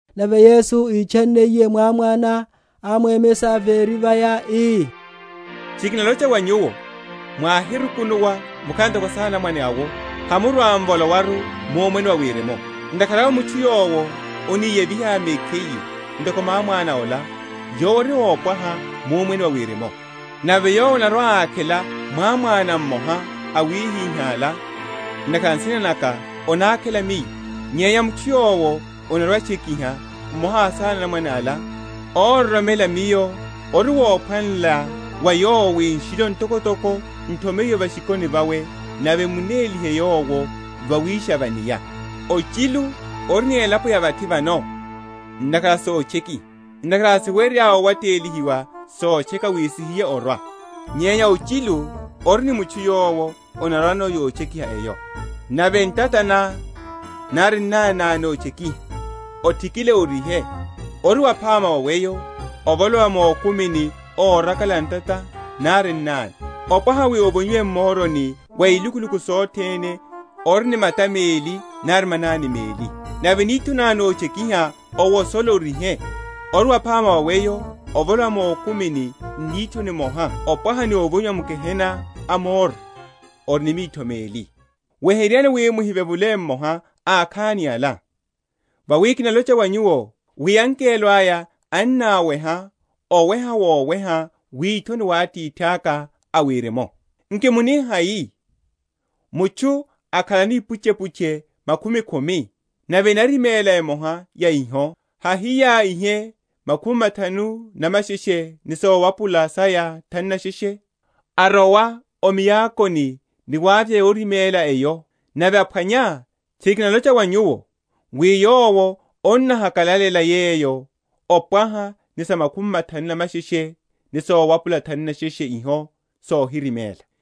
Nave Yesu ítchanniye mwámwana, ámwemesha véri vaya, ii, Tchiri kinalocha wa nyuwo, mwáhirukunuwa mukhala ntoko asanamwane awo, hamurwa‐m’volowaru mu Omwene wa Wirimu. Ntakhara awe mutchu yowo aniyeviha mekhiye ntoko mwámwana ola, yowo ori ópwaha mu Omwene wa Wirimu. Nave yowo anarwa‐ákhela mwámwana mmoha awihiha’la ntakhara a nsina naka, anákhela Miyo: nyenya mutchu yowo anarwa‐atchekiha mmoha a asanamwane ala, óroromela Miyo ori wophwanela wa yowo wi nshilo ntokotoko n’thomeyiwe va’shikoni vawe nave emunélihe yowo vawísha va’nia. Ochilu ori ni elapo ya vathi vano ntakhara a sotchekiha! ntakhara hasiwerya owatelihiwa sotcheka wi sihiye orwa, nyenya ochilu ori ni mutchu yowo anarwano yotchekiha eyo. Nave ntata ná, nari nnani ná nótchekiha, othikile, orihe: ori waphama wa weyo, ovolowa mukumini órakala ntata nari nnani, opwaha wi ovonyiwe m’moroni wa ilukuluku sothene, ori ni mata meli nari manani meli. Nave nitho ná nótchekiha, owosole, orihe: ori waphama wa weyo ovolowa mukumini n’nitho nimoha opwaha ni ovonyiwa m’gehena a moro, ori ni mitho meli. Weheryani wi muhivevule mmoha a akhani ala; vawi kinalocha wa nyuwo, wi angelo aya ennaweha oweha woweha withoni wa Atithaka a Wirimu. Nki muni hai? mutchu akhalano ipuchepuche makhumi khumi, nave enariméla emoha ya iho, hahiya ihe makhumi mathanu na masheshe ni sowapula saya thanu na sheshe, arowa o miakoni, ni wavya yoriméla eyo? Nave aphwanya, tchiri kinalocha wa nyuwo, wi yowo anahakalalela yeyo opwaha ni sa makhumi mathanu na masheshe ni owapula thanu na sheshe iho sohiriméla.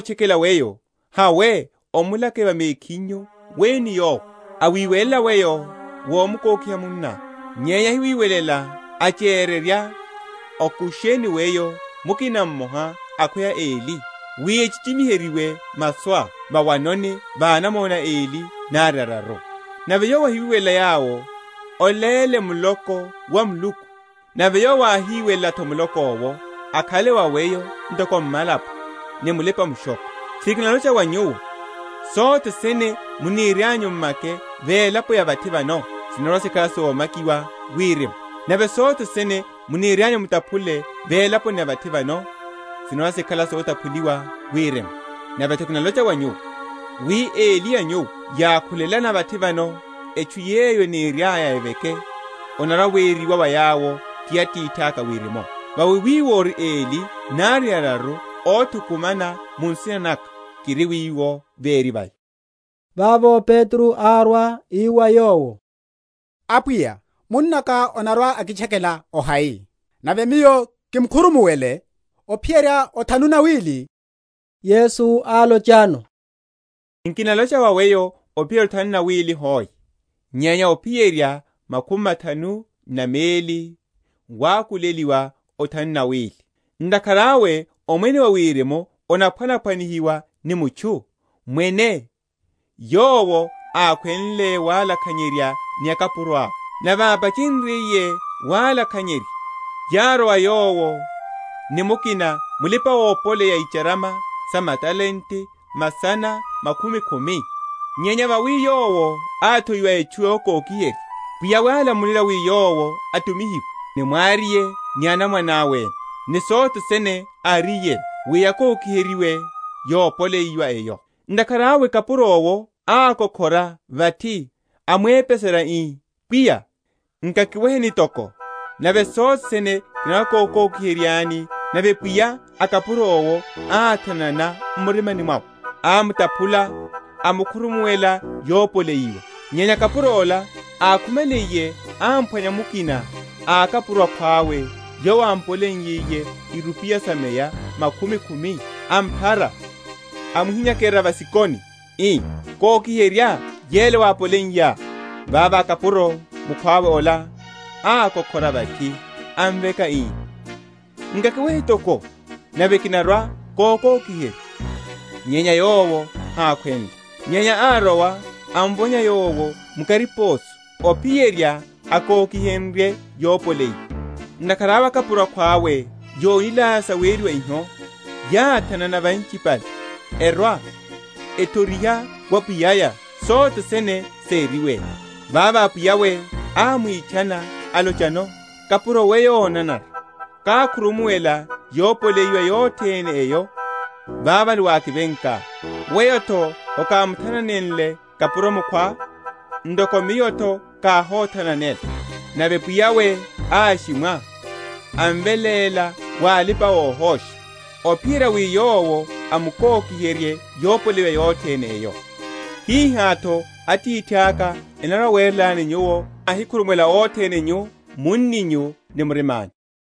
Nave khwino munná orimotchekela weyo, hawe, omulake va mekhinyu weyo ni yowo: awiwelela weyo, wómkokiha munná. Nyenya áhiwelela, achererya okusha ni weyo mukina mmoha akhweya eli, wi echichimiheryiwe masuá, vawanoni va anamona eli nari araru. Nave yowo áhiwelela yawo, oléle Muloko wa Muluku: nave yowo áhiwelela’tho Muloko’wo, akhale wa weyo ntoko mmalapo ni mulipa‐mushokho. Tchiri kinalocha wa nyuwo, Sothe sene muniryanyu mmake va elaponi ya vathi vano, sinarwa‐sikhala soma?-?kiwa Wirimu: nave sothe sene muniryanyu mutaphule va elaponi ya vathi vano, sinarwa‐sikhala sotaphuliwa Wirimu. Nave’tho kinalocha wa nyuwo wi eli a nyuwo yákhulelana vathi vano etchu yeyo eniryaya eveke, onarwa‐weriwa wa yawo ti Atithaka a Wirimu. Vawi wiwo ori eli nari araru othukumanela mu nsina naka, kiri wiwo véri vaya. Vavo Petro árwa, ii wa yowo, Apwiya, munnaka anarwa‐akitchekela ohai, nave miyo kimkhurumuwele? ophiyerya othanu na wili? Yesu álochano, Nkinalocha wa weyo ophiyerya othanu na wili hoe, nyenya ophiyerya makhumi mathanu na meli wákuleliwa othanu na wili. Ntakhara awe Omwene wa Wirimu onaphwanaphwanihiwa ni mutchu, mwene, yowo ákhwenle walakhanyerya ni akapuro awe. Nave ápachenryiye walakhanyerya, yárwa wa yowo ni mukina mulipa‐opoleya a icharama sa matalente masana makhumi khumi. Nyenya vawi yowo áthowiwa etchu yokokiherya, pwiya’we álamulela wi yowo atumihiwe, ni mwariye ni anamwane awe ene, ni sothe sene áriyeno, wi yakoki?-?heryiwe yopoleyiwa eyo. Ntakhara awe kapuro’wo ákokhora vathi, amwepeserya, ii, Pwiya, nkakiweheni toko, nave sothene kinarwa‐kokokiheryani. Nave pwiya a kapuro’wo áthanana m’murimani, amtaphula, amkhurumuwela yopoleyiwa. Nyenya kapuro ola, ákhumaliye áphwanya mukina a akapuro akhwawe yowo ámpoleiye irupiya sa meya makhumi khumi, amphara, amuhinyakerya va’shikoni, ii, Kokiherya yele wápoleiyá. Vavo kapuro mukhwawe ola ákokhora vathi, amveka, ii, Nkakiwehe toko, nave kinarwa‐kokokiherya. Nyenya yowo hákhwenle: nyenya árowa, amvonya yowo mu kariposo, ophiyerya akokiherye yopoleyiwa. Ntakhara awe akapuro akhwawe yónilaya saweriwa iho, yáthanana winchipale, erwa, ethoriha wa pwiya’ya sothe sene seriwe. Vavo pwiya’we ámwitchana, alochano, Kapuro weyo ónanara, káhokhurumuwela yopoleyiwa yothene eyo vavale wákivenká: weyo’tho hokámuthananenle kapuro mukhwá, ntoko miyo’tho káhóthananela. Nave pwiya’we áshimwa, amveléla wa alipa‐ohosha, ophiyerya wi yowo amkokiherye yopoleyiwa yothene eyo. Hihá’tho Atithaka anarwa‐awerelani, nyuwo mwáhikhurumuwela othene nyu munninyu ni murima’nyu.